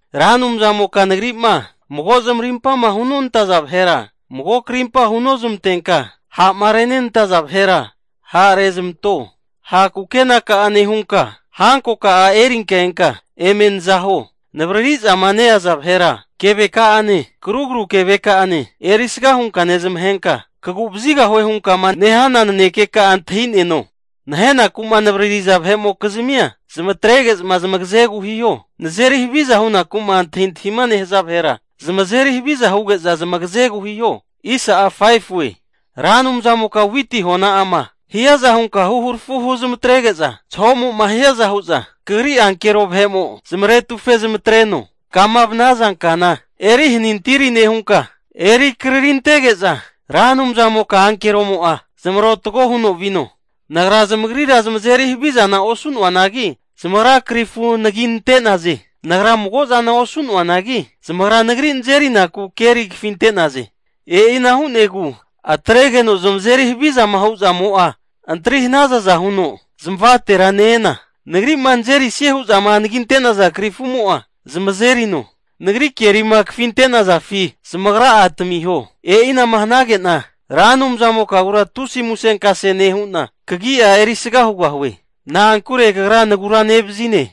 Ra Anumzamoka nagri'ma mago zamarimpama hunontaza vahera mago krimpa hunozmantenka, ha'ma renantaza vahera ha'rezmanto. Ha' kukenaka'a nehunka, hankoka'a erinka enka eme naza huo. Navaririzama neaza vahera keveka'ane, karugru keveka'ane erisga hunka nezmahegena, kagu'vazigahue hunkama nehana nanekeka'agura antahineno. Nahenaku'ma nenavaririza vahe'mokizmia zamatrege'za zamagazegu hiho. Nazeri haviza hunaku'ma antahintahima nehaza vahera zamazeri haviza huge'za zamagazegu hiho. Ra Anumzamoka witi hona'ama hiaza hunka huharafu huzmatrege'za zahomo'ma hiaza hu'za Kagri ankero vahe'mo'za zamaretufe zamatreno. Kama vanaza kana eri hanintiri nehunka, eri krarintege'za Ra Anumzamoka ankeromo'a zamarotago huno vino. Nagra zamagrira zamazeri havizana osu'noanagi, zamagra karifu anaginte nante'naze. Nagra mago zana osu'noanagi zamagra nagri nazerinaku keri kafinte'naze. E'ina hu'negu atregeno zamazeri havizama huzamo'a antri hanazaza huno zamavatera ne-ena, nagri'ma nazerisie hu'zama anaginte'naza krifumo'a zamazerino. Nagri kerima kafinte'nazafi, zamagra'a tamiho. E'ina'ma hanage'na Ra Anumzamokagura tusi musenkase nehu'na, kagi'a erisaga hugahue, na'ankure Kagra naguranevazine.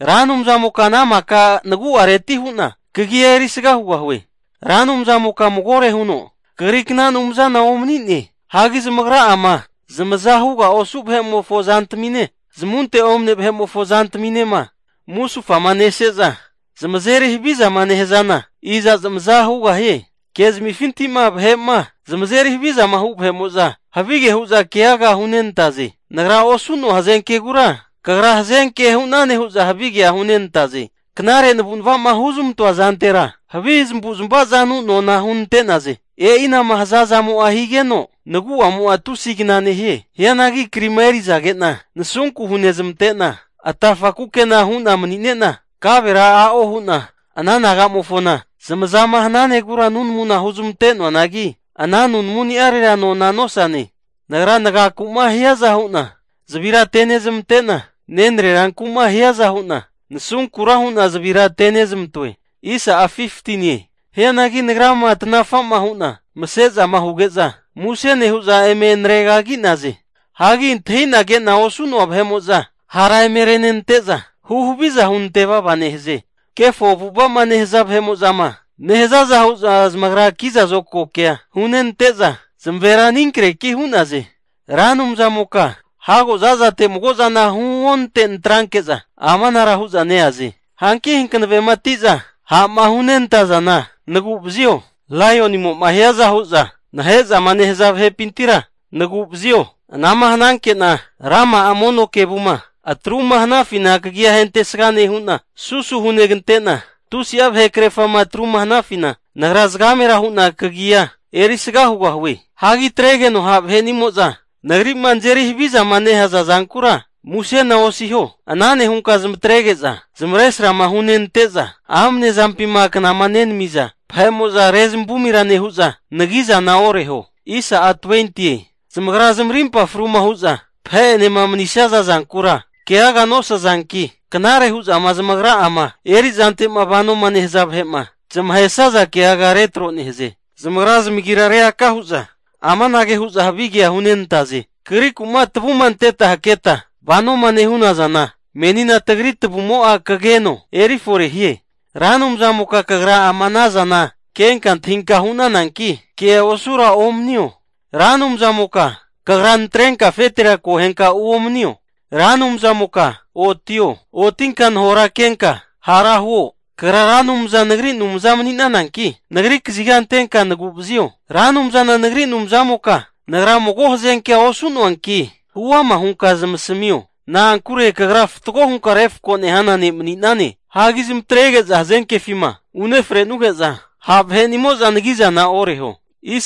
Ra Anumzamoka ana maka nagu'areti hu'na kagia erisga hugahue. Ra Anumzamoka magore huno Kagrikna anumzana omani'ne. Hagi zamagra'ama zamaza huga osu vahe'mofo zantamine, zmunte omne vahe'mofo zantaminema musufama neseza zamazeri havizama nehazana iza zamaza hugahie. Kezmifinti'ma vahe'ma zamazeri havizama hu vahe'mo'za, havige hu'za keaga hunenantaze. Nagra osu'noa hazenkegura kagra hazenke hu'nane hu'za havigea hunenantaze. Knare navu'nava'ma huzmantoa zantera, havi zamavuzmava zanu nona hunentaze. E'ina'ma haza zamo higeno, nagu'amo'a tusi kna nehie. Hianagi krima erizage'na nasunku hunezmante'na, atafa kukena hu'na manine'na kavera a'o hu'na ana nagamofona zamazama hananegura nunamuna hunezmantoanagi, ana nunamuni'arera nona nosane. Nagra nagaku'ma hiaza hu'na zavira atenezmante'na, nenreranku'ma hiaza hu'na nasunkura hu'na zavira atenezmantoe. Hianagi nagrama tanafa'ma hu'na mase'zama huge'za, muse nehu'za eme naregagi'naze. Hagi antahina ke'na osu'noa vahe'mo'za hara eme renenante'za huhaviza hunante vava nehaze. Kefo avu'ava'ma nehaza vahe'mo'zama nehazaza hu'za zamagra kiza zokagoke hunenante'za zamavera aninkreki hu'naze. Ra Anumzamoka hago zazate mago zana huonante natranke'za amanara hu'za neaze. Hanki hankavematiza ha'ma hunentazana naguvazio. Laionimo'ma hiaza hu'za nahe'zama nehaza vahepintira nagu'vazio. Ana'ma hananke'na rama'a mono kevuma atruma hanafina kagia ahentesga nehu'na, susu hunegante'na tusi'a vahekrerfama atruma hanafina nagra zagamera hu'na kagia erisga hugahue. Hagi atregeno ha' vahe'nimo'za nagri'ma nazeri havizama nehaza zankura musena osiho. Ana nehunka zamatrege'za zamavaresrama hunenante'za amnezampima knama nenamiza vahe'mo'za rezavumira nehu'za nagi'zana oreho. Zamagra zamarimpa fruma hu'za vahe'enema manisaza zankura keaga nosazanki, knare hu'zama zamagra'a erizante'ma vanoma nehaza vahe'ma zamahesaza keaga retro nehaze. Zamagra zamagira reaka hu'za amanage hu'za havigea hunentaze, kagriku'ma tavuma anteta haketa vanoma nehunazana, meni tagri tavumo'a kageno eri fore hie. Ra Anumzamoka kagra ama ana zana kenka antahinka hu'nananki, kea osura omanio. Ra Anumzanimoka Kagra natrenka afetera akohenka uomanio. Ra Anumzanimoka otio! Otinka nahorakenka hara huo. Kagra Ra Anumzana nagri Anumza mani'nananki nagri kaziga antenka naguravazio. Ra Anumzana nagri Anumzamoka nagra mago hazenkea osu'noanki, huama hunka zamasmio, na'ankure kagra fatgo hunka refko nehana ne' mani'nane. Hagi zamatrege'za hazenkefima unefrenuge'za ha' vahe'nimo'za nagi'zana oreho.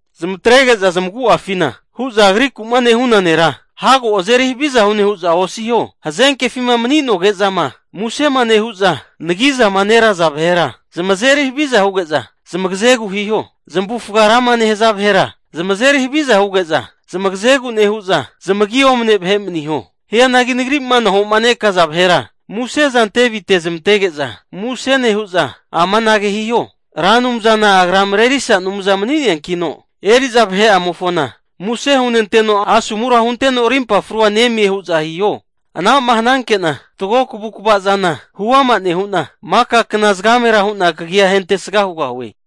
Zamatrege'za zamagu'afina hu'za agrikuma nehuna nera hago azeri haviza hu'ne hu'za osiho. Hazenkefima mani'noge'zama musema nehu'za nagizama neraza vahera zamazeri haviza huge'za zamagazegu hiho. Zamavufga rama nehaza vahera zamazeri haviza huge'za, zamagazegu nehu'za zamagi omne vahe maniho. Hianagi nagri'ma nahomanekaza vahera museza ante vitezmantege'za muse nehuza amanage hiho, Ra Anumzana agra marerisa Anumza mani'neankino eri'za vahe'amofona muse hunenteno asomura hunteno arimpa frua nemie hu'za hiho. Ana'ma hananke'na fatgo kavukvazana huama nehu'na, maka kna zagamera hu'na kagi'a ahentesga hugahue.